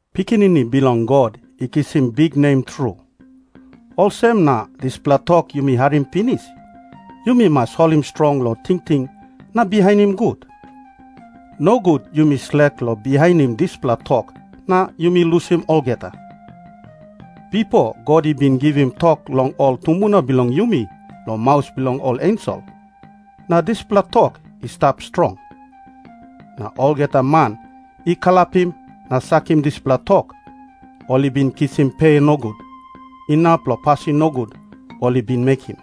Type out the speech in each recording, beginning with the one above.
Pikinini Bilong God i kisim biknem tru, olsem na dispela tok yumi harim pinis, yumi mas holim strong long tingting na bihainim gut. Nogut yumi slek long bihainim dispela tok na yumi lusim olgeta. Bipo God i bin givim tok long ol tumbuna bilong yumi long maus bilong ol ensel, na dispela tok i stap strong. Na olgeta man i kalapim na sakim dispela tok, ol i bin kisim pe nogut inap long pasin nogut ol i bin mekim.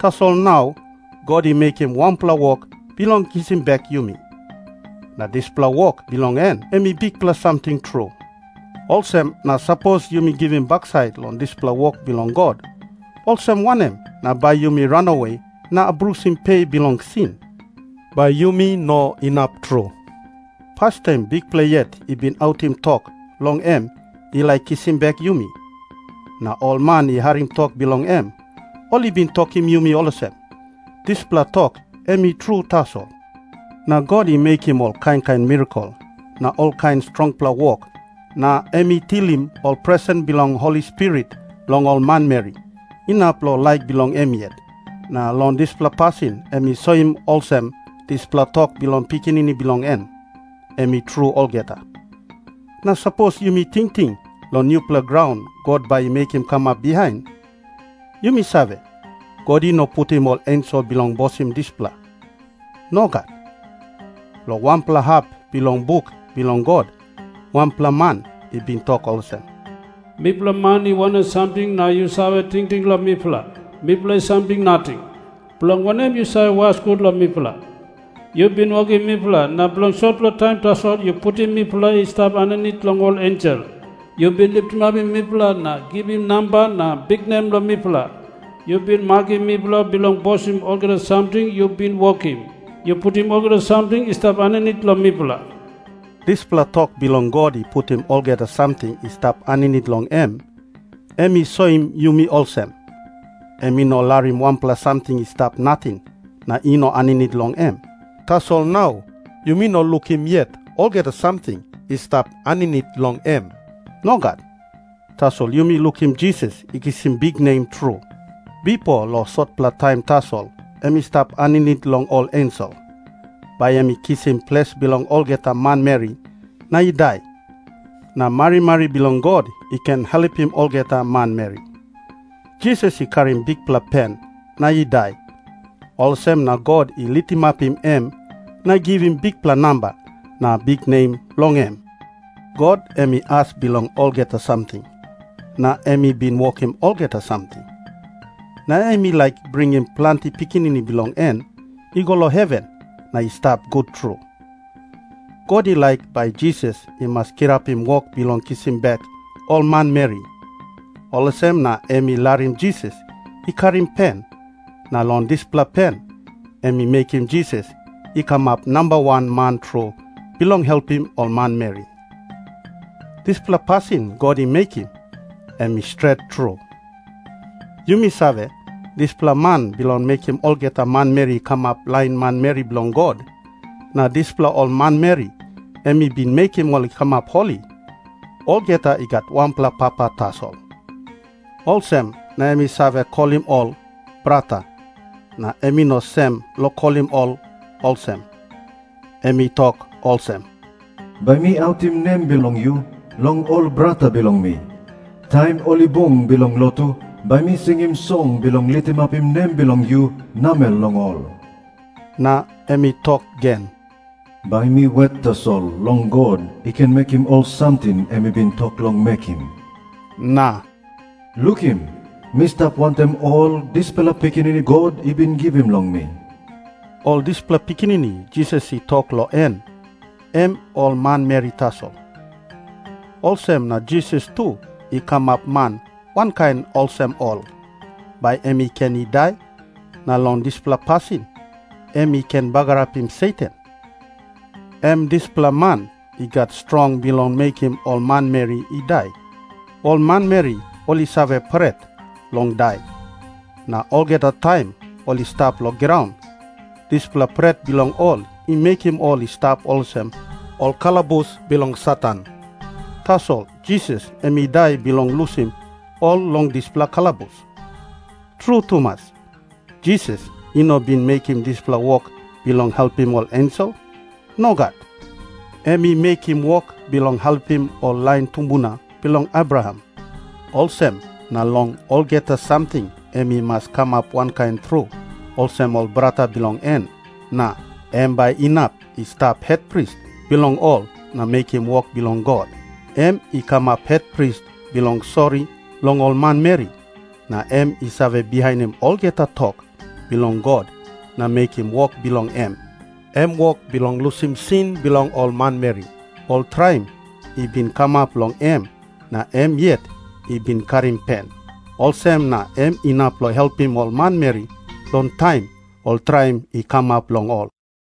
Tasol nau God i mekim wanpela wok bilong kisim bek yumi, na dispela wok bilong en em i bikpela samting tru. Olsem na sapos yumi givim baksait long dispela wok bilong God, olsem wanem na bai yumi ranawe na abrusim pe bilong sin? Bai yumi no inap tru.Pastaim Bikpela yet i bin autim tok long em i laik kisim bek yumi. Na ol man i harim tok bilong em, ol i bin tokim yumi olsem, "Dispela tok em i tru tasol." Na God i mekim ol kain kain mirakel na olkain strongpela wok, na em i tilim ol presen bilong Holi Spirit long ol manmeri, inap long laik bilong em yet, na long dispela pasin em i soim olsem dispela tok bilong Pikinini bilong en, em i tru olgeta. Na sapos yumi tingting long nupela graun God bai i mekim kamap bihain, yumi save, God i no putim ol ensel bilong bosim dispela. Nogat. Long wanpela hap bilong buk bilong God wanpela man i bin tok olsem, "Mipela man i wanem samting, na yu save tingting long mipela? Mipela i samting nating. Bilong wanem yu save was gut long mipela? Yu bin wokim mipela, na bilong sotpela taim tasol yu putim mipela i stap aninit long ol ensel. Yu bin litimapim mipela na givim namba na biknem long mipela. Yu bin makim mipela bilong bosim olgeta samting yu bin wokim. Yu putim olgeta samting i stap aninit long mipela." Dispela tok bilong God i putim olgeta samting i stap aninit long em, em i soim yumi olsem, em i no larim wanpela samting i stap nating na i no aninit long em. Tasol nau yumi no lukim yet olgeta samting i stap aninit long em. Nogat. Tasol yumi lukim Jisas i kisim biknem tru. Bipo long sotpela taim tasol em i stap aninit long ol ensel, bai em i ken kisim ples bilong olgeta manmeri na i dai, na marimari bilong God i ken helpim olgeta manmeri. Jisas i karim bikpela pen na i dai, olsem na God i litimapim em na i givim bikpela namba na biknem long em. God em i as bilong olgeta samting, na em i bin wokim olgeta samting. Na em i laik bringim planti pikinini bilong en i go long heven na i stap gut tru. God i laik bai Jisas i mas kirapim wok bilong kisim bek ol manmeri, olsem na em i larim Jisas i karim pen, na long dispela pen em i mekim Jisas i kamap nambawan man tru bilong helpim ol manmeri. Dispela pasin God i mekim, em i stret tru. Yumia save, dispela man bilong mekim olgeta manmeri i kamap lain manmeri bilong God, na dispela ol manmeri em i bin mekim ol i kamap holi, olgeta i gat wanpela papa tasol. Olsem na em i save kolim ol "brata", na em i no sem long kolim ol olsem. Em i tok olsem, "Bai mi autim nem bilong yu long ol brata bilong mi. Taim ol i bung bilong lotu bai mi singim song bilong litimapim nem bilong yu namel long ol." Na em i tok gen, "Bai mi wet tasol long God i ken mekim ol samting em i bin tok long mekim," na "Lukim. Mi stap wantaim ol dispela pikinini God i bin givim long mi." Ol dispela pikinini Jisas i tok long en, em ol manmeri tasol. Olsem na Jisas tu i kamap man wankain olsem ol, bai em i ken i dai, na long dispela pasin em i ken bagarapim Satan, em dispela man i gat strong bilong mekim ol manmeri i dai. Ol manmeri ol i save pret long dai, na olgeta taim ol i stap long graun, dispela pret bilong ol i mekim ol i stap olsem ol kalabus bilong Satan. Tasol Jisas em i dai bilong lusim ol long dispela kalabus. Tru tumas, Jisas i no bin mekim dispela wok bilong helpim ol ensel. Nogat. Em i mekim wok bilong helpim ol lain tumbuna bilong Abraham. Olsem na long olgeta samting em i mas kamap wankain tru olsem ol brata bilong en, na em bai inap i stap hetpris bilong ol na mekim wok bilong God. Em i kamap hetpris bilong sori long ol manmeri, na em I save bihainim olgeta tok bilong God na mekim wok bilong em, em wok bilong lusim sin bilong ol manmeri. Ol traim i bin kamap long em na em yet I bin karim pen. Olsem na em inap long helpim ol manmeri long taim ol traim i kamap long ol.